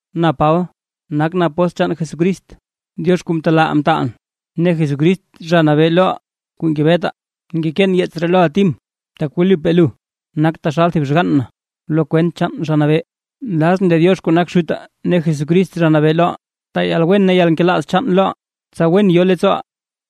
Na Paba, nakʼn apóstl chaan Jesucrist, Diox kuu mtelaaʼaa mtaalʼn ne Jesucrist Zha Nabee loʼaa kuu ngebetaa. Ngekeen yeets ree loʼa Tim. Tak wlipaa lu nak thib xgann na lo kwent chaan Zha Nabee. Nlazʼn lee Diox kuu nak Xutaa ne Jesucrist Zha Nabee loʼaa taa yalwen ne yalnkelaaz chaan loʼa, tsa wen yo leettsooʼa.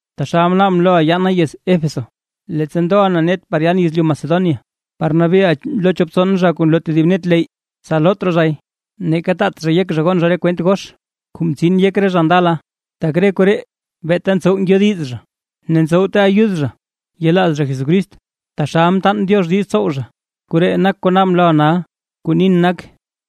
Taxal mnaabʼn loʼa yaana yez Éfeso, leettsa ndoʼa na net par yan yezlyu Macedonia, par nabeeʼa lo chop tson zha kuu nloo tedib net leyy, tsa loot raa zhay, neeka taat zha yek zha gon zha re kwent gox kuu mtsin yek re zha ndala. Tak re koree beeta ntsow ngyodiz zha ne ntsowte ayud zha yelaaz zha Jesucrist taxal mtaan Diox diiz tsow zha, koree nak kuu naabʼn loʼa nal. Kuu nin nak: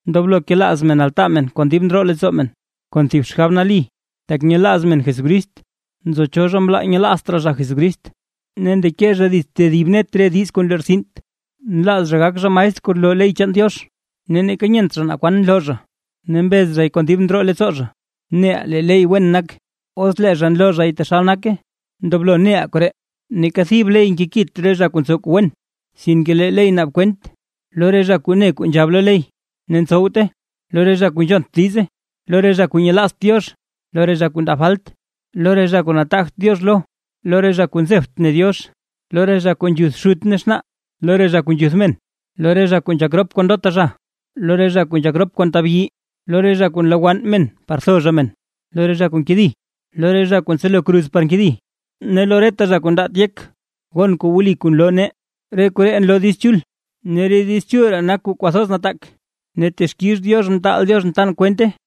Ndoblo kelaaz men altaa men kon dib ndroo leettsoo men, kon thib xgab nali, tak nyelaaz men Jesucrist. Nzo cho zha mlaa zha nyelaazt raa zha Jesucrist, ne ndeke zha dits tedib net re diiz kuu nlortsint. Nlaaz zha gak zha maestr kuu loo ley chaan Diox, ne neeka nyent zha naa kwan nloo zha ne mbez zhay kon dib ndroo leettsoo zha. Neʼaa lee ley wen nak, os lee zha nloo zhay taxal nake. Ndoblo neʼaa koree, neeka thib ley nkekit re zha kuu ntsow kuu wen, sinke lee ley naab kwent: lo re zha kuu ne kuu nzhab lo ley, ne ntsowte, lo re zha kuu nzhont diize, lo re zha kuu nyelaazt Diox, lo re zha kuu ndaa falt, lo re zha kuu nataagt Diox lo, lo re zha kuu nzebt ne Diox, lo re zha kuu nzhuth xut ne xnaa, lo re zha kuu nzhuth men, lo re zha kuu nzhak rop kon ndota zha, lo re zha kuu nzhak rop kon tabyi, lo re zha kuu nlowann men par tho zha men, lo re zha kuu nkedi, lo re zha kuu ntselo kruz par nkedi, ne lo reta zha kuu ndaat yek gon kuu wli kuu nloo nee. Re koree nloo Diiz Chul. Ne Diiz Chul ree nak kuu kwathoz nataak, ne texkix Diox mtaal Dioxʼn tan kwente.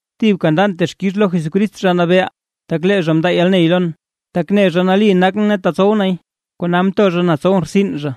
Thibka ndan texkix lo Jesucrist Zha Nabeeʼaa, tak lee zha mndaa yalney lon, tak ne zha nali nakʼn ne tetsow nay, kona mto zha na tsowʼn rtsin zha.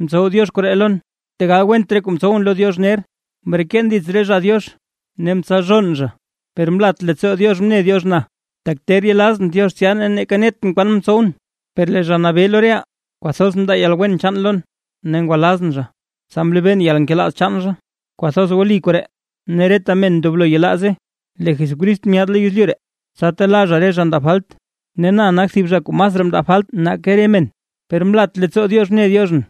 Mtsow Diox koree lon, tegal went re kuu mtsowʼn lo Diox ner, mreken dits re zha Diox ne mtsalzhoon zha. Per mlat leettsoo Diox mne Diox na, tak ter yelazʼn Diox tsya ne neeka netʼn naa kwan mtsowʼn. Per lee Zha Nabee lo reʼaa kwathoz mndaa yalwen chaan lon, ne ngwalazʼn zha, tsa mlebeen yalnkelaaz chaan zha. Kwathoz wli koree ne reta men ndoblo yelaaze: Lee Jesucrist myaad lo yezlyu ree, tsa telaa zha re zha ndaa falt. Ne na nak thib zha kuu masraa mndaa falt nake re men. Per mlat leettsoo Diox mne Dioxʼn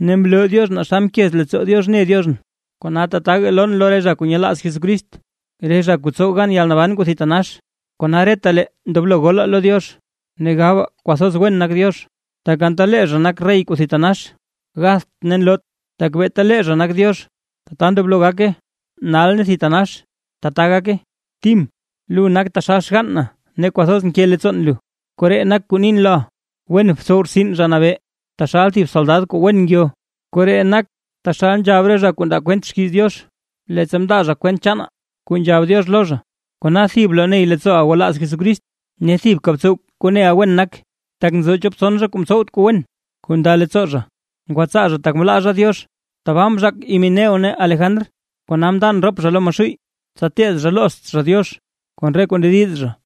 ne mloo Diox naa xa mkez leettsoo Diox mne Dioxʼn, kona tataga lon lo re zha kuu yelaaz Jesucrist, re zha kuu tsow gan yalnaban kuu thitanax. Kona retalee ndoblo golaa lo Diox ne gabaa kwathoz wen nak Diox, tak anta lee zha nak rey kuu thitanax gatht ne nloot, tak beeta lee zha nak Diox. Tata ndoblo gake nal ne thitanax. ¡Tata gake! Tim, lu nak taxal xgann na ne kwathoz nke leettsoon lu. Koree nak kuu nin loʼa, wen btsow rtsin Zha Nabee taxal thib soldad kuu wen ngyo. Koree nak taxal nzhab re zha kuu ndaa kwent xkiiz Diox, leettsa mndaa zha kwent chaana kuu nzhab Diox lo zha. Kona thib bloney leettsooʼa gwalaaz Jesucrist ne thibka btsow kuu neʼa wen nak. Tak nzo chop tson zha kuu mtsowt kuu wen kuu nda leettsoo zha, ngwatsaa zha tak mlaa zha Diox. Tbaa mzhaak Himeneo ne Alejandr, kona mndan rop zha lo Maxuuy, tsa teed zha loozt zha Diox kon re kuu ndediz zha.